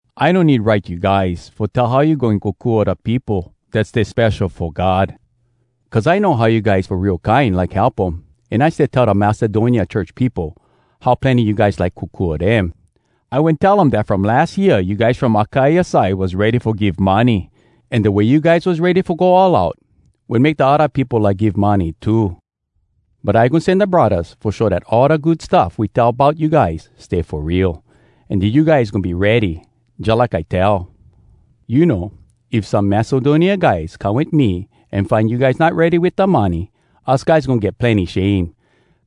I no need write you guys fo tell how you goin kokua da peopo dat stay spesho fo God. Cuz I know how you guys fo real kine like help um, an I stay tell da Macedonia church peopo how plenny you guys like kokua dem. I wen tell um dat from las year you guys from Akaia side was ready fo give money, an da way you guys was ready fo go all out, wen make da odda peopo like give money too. But I goin sen da braddahs fo show dat all da good stuff we tell bout you guys stay fo real, an dat you guys goin be ready, jalike I tell. You know, if some Macedonia guys come wit me an find you guys not ready wit da money, us guys goin get plenny shame,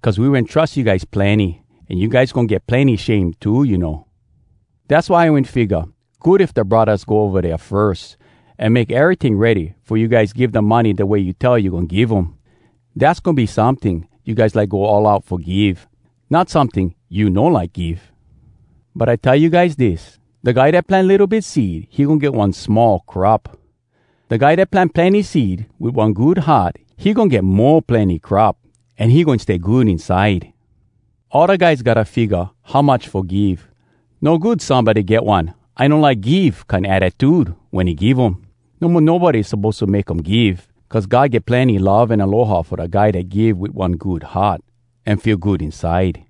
cuz we wen trus you guys plenny. An you guys goin get plenny shame too, you know. Dass why I wen figga, good if da braddahs go ova dea firs, an make eryting ready, fo you guys give da money da way you tell you goin give um. Dass goin be someting you guys like go all out fo give, not someting you no like give. But I tell you guys dis: “Da guy dat plant litto bit seed, he goin get one small crop. Da guy dat plant plenny seed wit one good heart, he goin get mo plenny crop, an he goin stay good inside.” All da guys gotta figga how much fo give. No good somebody get one “I no like give!” kine attitude wen he give um. No mo nobody suppose to make um give. Cuz God get plenny love an aloha fo da guy dat give wit one good heart an feel good inside.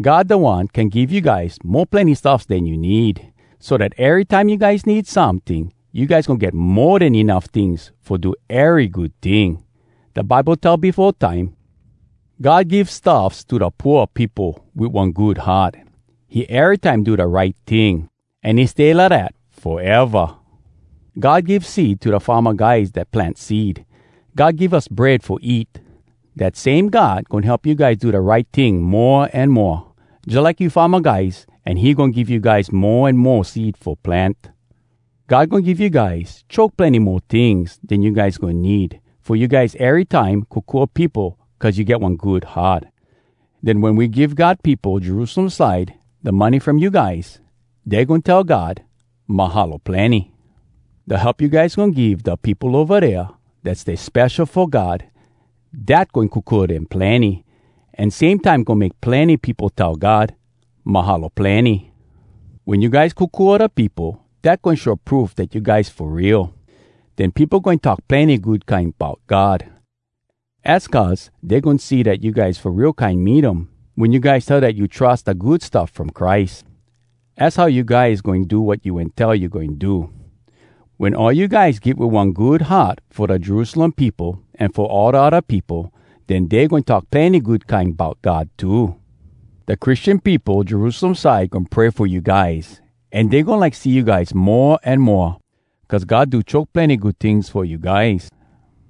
God da one can give you guys mo plenny stuffs den you need, so dat erytime you guys need someting, you guys goin get mo den enuff tings fo do ery good ting. Da Bible tell befo time, “God give stuffs to da pooa peopo Wit one good heart. He erytime do da right ting, An he stay lidat foeva.” God give seed to da farma guys dat plant seed. God give us bread fo eat. Dat same God goin help you guys do da right ting mo an moa, jalike you farma guys an he goin give you guys mo an mo seed fo plant. God goin give you guys choke plenny mo tings den you guys goin need fo you guys erytime kokua peopo cuz you get one good heart. Den wen we give God peopo Jerusalem side da money from you guys, dey goin tell God “Mahalo plenny.” Da help you guys goin give da peopo ova dea dat stay spesho fo God, dat goin kokua dem plenny, an same time goin make plenny peopo tell God “Mahalo plenny!” Wen you guys kokua da peopo, dat goin show proof dat you guys fo real. Den peopo goin talk plenny good kine bout God. Az cuz dey goin see dat you guys fo real kine mean um wen you guys tell dat you trus da Good Stuff From Christ. Az how you guys goin do wat you wen tell you goin do. Wen all you guys give wit one good heart fo da Jerusalem peopo an fo all da odda peopo, den dey goin talk plenny good kine bout God too. Da Christian peopo Jerusalem side goin pray fo you guys, an dey goin like see you guys mo an moa, cuz God do choke plenny good tings fo you guys.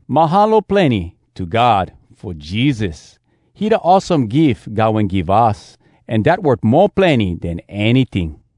“Mahalo plenny” to God fo Jesus! He da awesome gif God wen give us, an dat worth mo plenny den anyting.